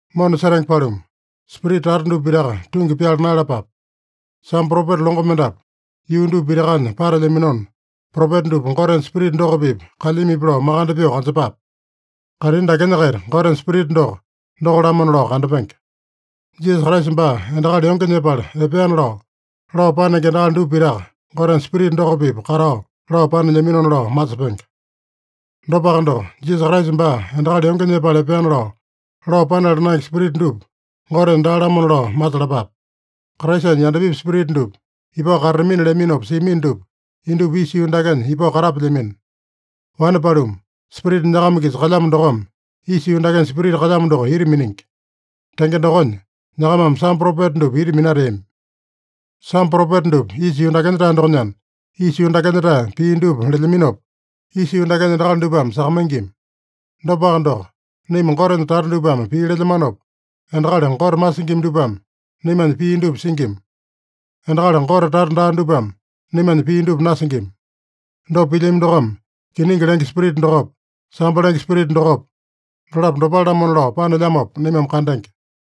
Mona setenge paluma, spirita tata dupa pitaka tungi pyala naeyalapape. Sambo propeta longo mendapu yuu dupa pitakanya patelyaminona, propeta dupa Gotenya Spirita doko-pipa kalyamipi lao makande pyoo kanjepape. Kaitini dakenya-kaita Gotenya Spirita doko, doko-lamona lao kandapenge. Jisasa Kraisa baa endakali yonge nyepala epeana lao, lao panenge endakali dupa pitaka, Gotenya Spirita doko-pipa katao lao panelyaminona lao masepenge. Dopaka doko, Jisasa Kraisa baa endakali yonge nyepala epeana lao, lao panala naenge spirita dupa, Gotenya daa-lamona lao masalapape. Kraisanya yandapipi spirita dupa ipao katatamina leaminopa siamino dupa, indupa isa yuu dakenya ipao katapelyamino. Wane paluma, Spirita nyakama-kisa kalyamo dokome isa yuu dakenya spirita kalyamo doko ita miningi. Tenge dokonya, nyakamame sambo propeta dupa ita minateami. Sambo propeta dupa isa yuu dakenya-tae dokonyana, isa yuu dakenya-tae pii dupa lelyaminopa, isa yuu dakenya endakali dupame sakamaingima. Dopaka doko, naima Gotenya tata dupame pii lelyamanopa, endakali Gote masingima dupame naimanya pii dupa singima. Endakali Gote tata daa dupame naimanya pii dupa nasingima. Dopa pilyami dokome, kiningi lenge Spirita dokopa, sambo lenge spirita dokopa, dolapo dopale-lamona lao panelyamopa naimame kandenge.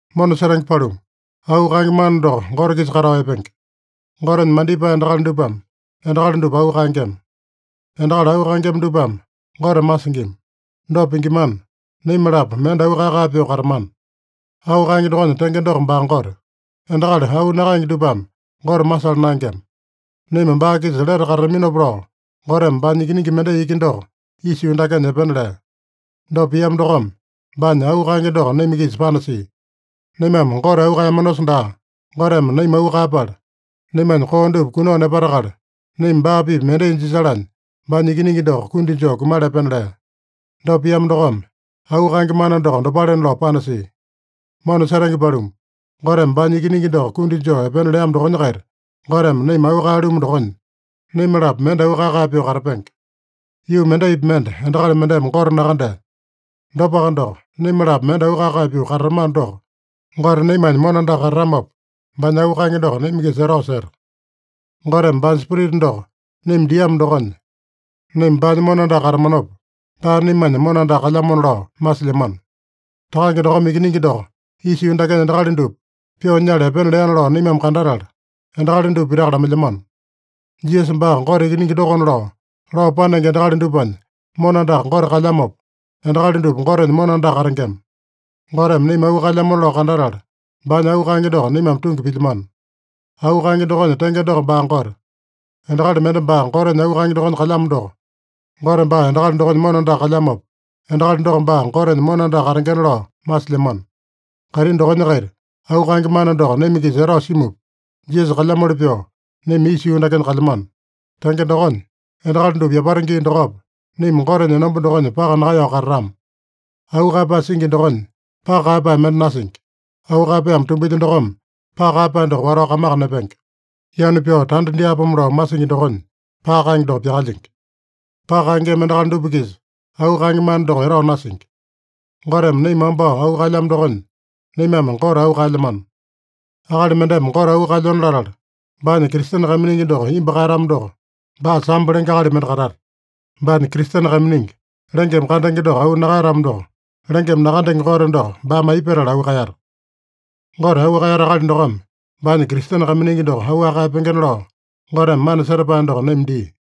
Mona setenge paluma, auu kaenge mana doko Gote-kisa katao epenge. Gotenya mandipae endakali dupame endakali dupa auu kaengema. Endakali auu kaengema dupame Gote masingima. Dopa pingimana, naima-lapo mende auu kae-kae pyoo katamana. Auu kaenge dokonya tenge doko baa Gote. Endakali auu nakaenge dupame Gote masala naengema. Naima baa-kisa lete katataminopa lao, Goteme baanya Ikiningi mendai iki doko isa yuu dakenya epena lea. Dopa piamo dokome, baanya auu kaenge doko naima-kisa panasia. Naimame Gote auu kaeyamanosa daa, Goteme naima auu kaeyapala, naimanya koo dupa kunao nepatakala, naima baa-pipa mendai jisalanya baanya Ikiningi doko kundi joo kumala epena lea. Dopa piamo dokome, auu kaenge mana doko dopalena lao panasia. Mona setenge paluma, Goteme baanya Ikiningi doko kundi joo epena leamo dokonya-kaita, Goteme naima auu kaeya-lumu dokonya, naima-lapo mende auu kae-kae pyoo katapenge. Yuu mendaipi mende endakali mendeme Gote nakandea. Dopaka doko, naima-lapo mende auu kae-kae pyoo katatamano doko, Gote naimanya mona andaka katatamopa, baanya auu kaenge doko naima-kisa etao seta. Goteme baanya Spirita doko naima diamo dokonya, naima baanya mona andaka katamanopa, baa naimanya mona andaka kalyamona lao masilyamano. Takange dokome Ikiningi doko isa yuu dakenya endakali dupa pyoo nyala epena leana lao naimame kandatala, endakali dupa pitaka lamailyamano. Jisasa baa Gote Ikiningi dokona lao, lao panenge endakali dupanya mona andaka Gote kalyamopa, endakali dupa Gotenya mona andaka katengema. Goteme naima auu kaelyamona lao kandatala, baanya auu kaenge doko naimame tungi pilyamano. Auu kaenge dokonya tenge doko baa Gote. Endakali mende baa Gotenya auu kaenge dokonya kalyamo doko, Gote baa endakali dokonya mona andaka kalyamopa, endakali doko baa Gotenya mona andaka katengena lao masilyamano. Kaitini dokonya-kaita auu kaenge mana doko naima-kisa etao simupa, Jisasa kalyamoli pyoo naima isa yuu dakenya kalyamano. Tenge dokonya, endakali dupa yapata gii dokopa, naima Gotenya enomba dokonya paka nakaeyao katatama. Auu kaeyapae singi dokonya, paka kaeyapae mende nasingi. Auu kaeyapaeme tumbilya dokome, paka kaeyapae doko watao kamaka nepenge. Yanu pyao tanda dyaapomo lao masingi dokonya, paka kaenge doko pyakalyingi. Paka kaengema endakali dupa-kisa auu kaenge mana doko etao nasingi. Goteme naima wambao auu kaeyamo dokonya, naimame Gote auu kaelyamano. Akali mendeme Gote auu kaelyona latala, baanya Kristene kaiminingi doko imbu kaeyatamo doko, baa sambo lenge akali mende katata. Baanya Kristene kaiminingi, lengeme kandenge doko auu nakaeyatamo doko, lengeme nakandenge Gote doko baame aipa petala auu kaeyata? Gote auu kaeyata akali dokome baanya Kristene kaiminingi doko auwaka kaeyapengena lao, Goteme mana setapae doko naima dia.